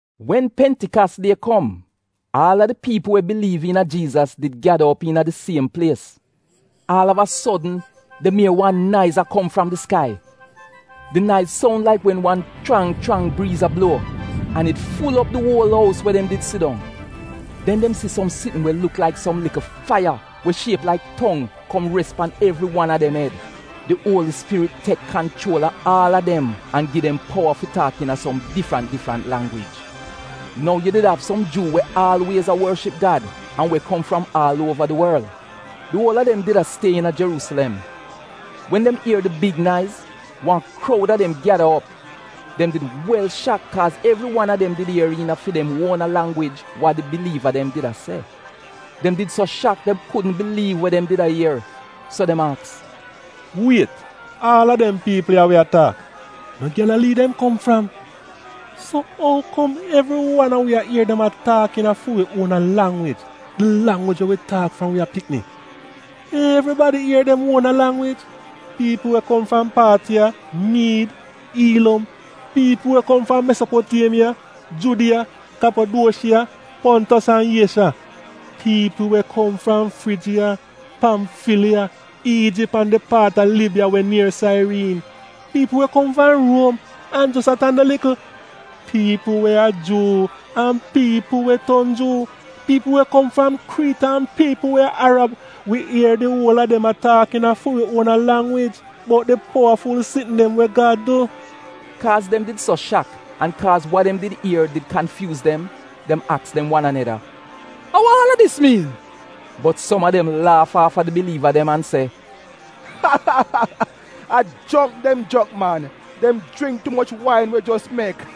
Wen Pentikas die kom, aal a di piipl we biliiv iina Jiizas did gyada op iina di siem plies. Aal av a sodn dem ier wan naiz a kom fram di skai. Di naiz soun laik wen wan chrang chrang briiz a bluo, an it ful op di uol ous we dem did sidong. Den dem si som sitn we luk laik som likl faiya we shiep laik tong kom res pan evri wan a dem ed. Di Uoli Spirit tek kanchuol a aal a dem an gi dem powa fi taak iina som difrant difrant langwij. Nou yu did av som Juu we aalwiez a worship Gad an we kom fram aal uova di worl. Di uol a dem did a stie iina Jeruusilem. Wen dem ier di big naiz, wan kroud a dem gyada op. Dem did wel shak kaaz evri wan a dem did ier iina fi dem uona langwij wa di biliiva dem did a se. Dem did so shak dem kudn biliiv we dem did a ier, so dem aks, “Wiet, aal a dem piipl ya we a taak, no Gyalalii dem kom fram? So ou kom evri wan a wi ier dem a taak iina fi wi uon langwij, di langwij we wi taak fram wi a pikni? Evribadi ier dem uona Langwij, piipl we kom fram Paatiya, Miid, Iilom, piipl we kom fram Mesopotiemiya, Judiya, Kyapaduoshiya, Pontos, an Iezha, piipl we kom fram Frijiya, Pamfiliya, Iijip an di paat a Libiya we nier sairiin; piipl we kom fram Ruom an jos a tan de likl, (piipl we a Juu an piipl we ton Juu); piipl we kom fram Kriit an piipl we a Arab - wi ier di uol a dem a taak iina fi wi uona langwij bout di powaful sitn dem we Gad du! Kaaz dem did so shak an kaaz wa dem di ier did kanfyuuz dem, dem aks dem wan aneda, “A wa aal a dis miin?” Bot som a dem laaf aafa di biliiva dem an se, “A jrongk dem jrongk man. Dem jringk tu moch wain we jos mek.”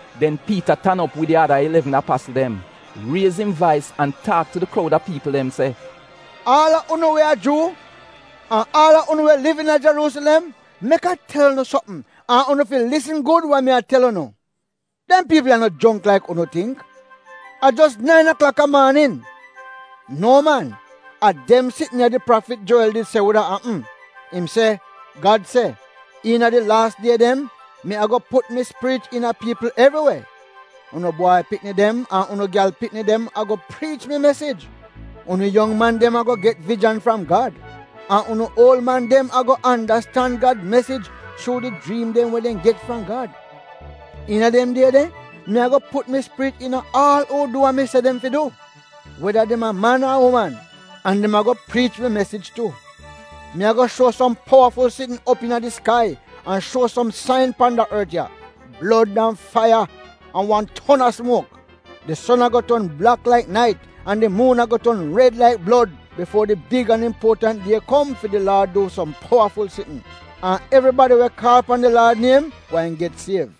Den Piita tan op wid di ada ilevn apasl dem, riez im vais an taak tu di kroud a piipl dem se, “Aal a unu we a Juu, an aal a unu we liv iina Jeruusilem, mek a tel unu sopm an unu fi lisn gud wa mi a tel unu. Dem piipl ya no jongk laik unu tingk. A jos nain aklak a maanin! No man, a dem sitn ya di prafit Jowel did se wuda apm. Im se: “Gad se, ‘Iina di laas die dem, mi ago put mi Spirit iina piipl evri we. Unu bwai pikni dem an unu gyal pikni dem ago priich mi mesij. Unu yong man dem ago get vijan fram Gad, an unu uol man dem ago andastan Gad mesij chuu di jriim dem we dem get fram Gad. Iina dem die de mi ago put mi Spirit iina aal uu du we mi se dem fi du, weda dem a man ar uman, an dem ago priich mi mesij tu. Mi ago shuo som powaful sitn op iina di skai an shuo som sain pan da ort ya, blod an faiya an wan ton a smuok. Di son ago ton blak laik nait an di muun ago ton red laik blod bifuo di big an impuotant die kom fi di Laad du som powaful sitn. An evribadi we kaal pan di Laad niem gweehn get siev.’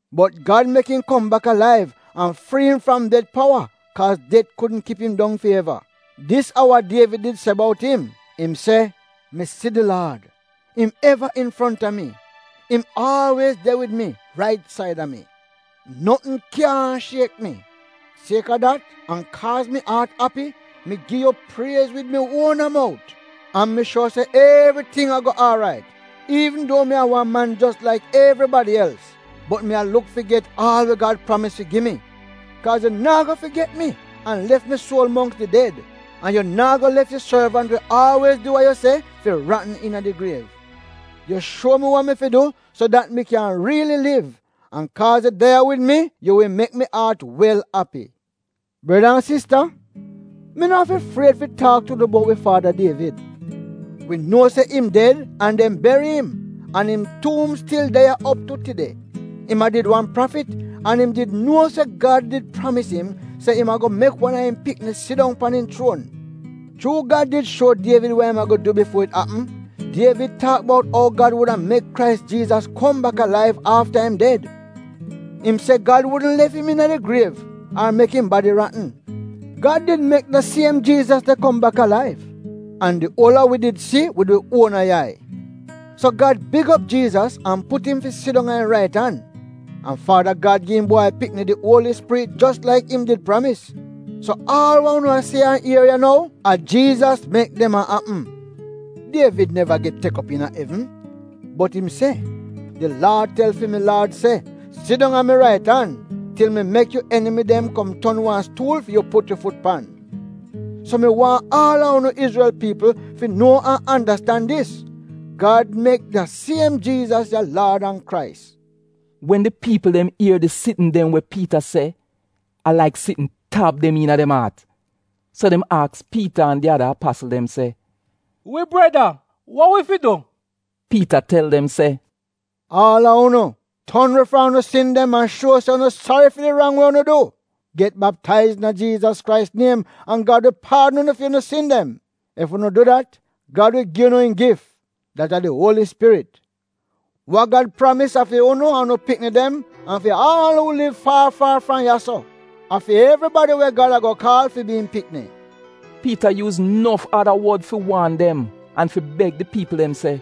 Bot Gad mek im kom bak alaiv an frii im fram det powa kaaz det kudn kip im dong fi eva. Dis a wa Dievid did se bout im: Im se, ‘Mi si di Laad, im eva infronta mi. Im aalwiez de wid mi, rait saida mi. Notn kyaahn shiek mi. Sieka dat an kaaz mi aat api, mi gi yu priez wid mi uona mout. An mi shuor se evriting ago aarait, iivn duo mi a wan man jos laik evribadi els, bot mi a luk fi get aal wa Gad pramis fi gi mi. Kaaz yu naa go figet mi an lef mi suol mongks di ded, an yu naa go lef yu sorvant we aalwiez du wa yu se fi ratn iina di griev. Yu shuo mi wa mi fi du so dat mi kyan riili liv. An kaaz yu de ya wid mi, yu wi mek mi aat wel api.’ “Breda an sista mi no afi fried fi taak tu unu bout wi faada Dievid. Wi nuo se im ded an dem beri im, an im tuum stil de ya op tu tide. Im a did wan prafit an im did nuo se Gad did pramis im se im ago mek wan a im pikni sidong pan im chuon. Chuu Gad did shuo Dievid wa im ago du bifuo it apm, Dievid taak bout ou Gad wuda mek Krais Jiizas kom bak alaiv afta im ded. Im se Gad wudn lef im iina di griev ar mek im badi ratn. Gad did mek da siem Jiizas de kom bak alaiv, an di uol a wi did si wid wi uona yai. So Gad big op Jiizas an put im fi sidong a im rait an. An Faada Gad gi im Bwai Pikni di Uoli Spirit jos laik im did pramis. So aal wa unu a si an a ier ya nou, a Jiizas mek dem a apm. Dievid neva get tek op iina evn, bot im se “‘Di Laad tel fi mi Laad se: “Sidong a mi rait an til mi mek yu enimi dem kom ton wan stuul fi yu put yu fut pan.”’ “So mi waahn aal a unu Izrel piipl fi nuo an andastan dis: Gad mek da siem Jiizas ya Laad an Krais.” Wen di piipl dem ier di sitn dem we Piita se, a laik sitn tab dem iina dem aat. So dem aks Piita an di ada apasl dem se, “Wi breda, wa wi fi du?” Piita tel dem se “Aal a unu, ton we fram unu sin dem an shuo se unu sari fi wa unu du, get baptaiz iina Jiizas Krais niem an Gad wi paadn unu fi unu sin dem. Ef unu du dat, Gad wi gi unu im gif, dat a di Uoli Spirit. Wa Gad pramis a fi unu an unu pikni dem an fi aal uu liv faar faar fram ya-so — fi evribadi we Gad ago kaal fi bi im pikni.” Piita yuuz nof ada wod fi waan dem an fi beg di piipl dem se,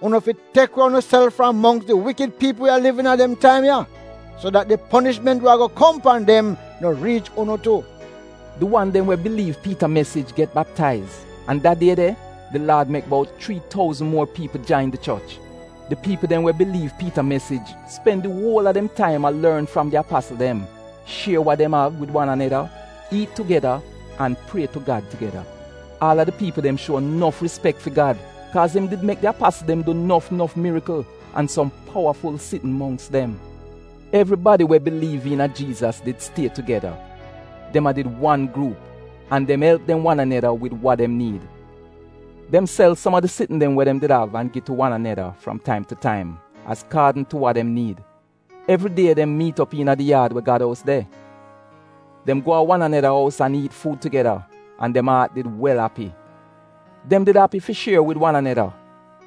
“Unu fi tek we unuself fram mongks di wikid piipl we a liv iina dem taim ya, so dat di ponishment we ago kom pan dem no riich unu tu.” Di wan dem we biliiv Piita mesij get baptaiz, an da die de, di Laad mek bout chrii touzn muor piipl jain di choch. Di piipl dem we biliiv Piita mesij spen di uol a dem taim a lorn fram di apasl dem, shier wa dem av wid wan aneda, iit tugeda an prie tu Gad tugeda. Aal a di piipl dem shuo nof rispek fi Gad kaaz im did mek di apasl dem du nof nof mirikl an som powaful sitn mongks dem. Evribadi we biliiv iina Jiizas did stie tugeda — dem a did wan gruup, an dem elp dem wan aneda wid wa dem niid. Dem sel som a di sitn dem we dem did av an gi tu wan aneda fram taim tu taim azkaadn tu wa dem niid. Evridie dem miit op iina di yaad we Gad ous de. Dem go a wan aneda ous an iit fuud tugeda an dem aat did wel api. Dem did api fi shier wid wan aneda.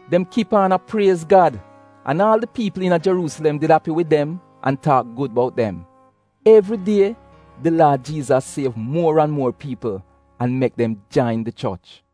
Dem kip aan a priez Gad an aal di piipl iina Jeruusilem did api wid dem an taak gud bout dem. Evridie di Laad Jiizas siev muor an muor piipl an mek dem jain di choch.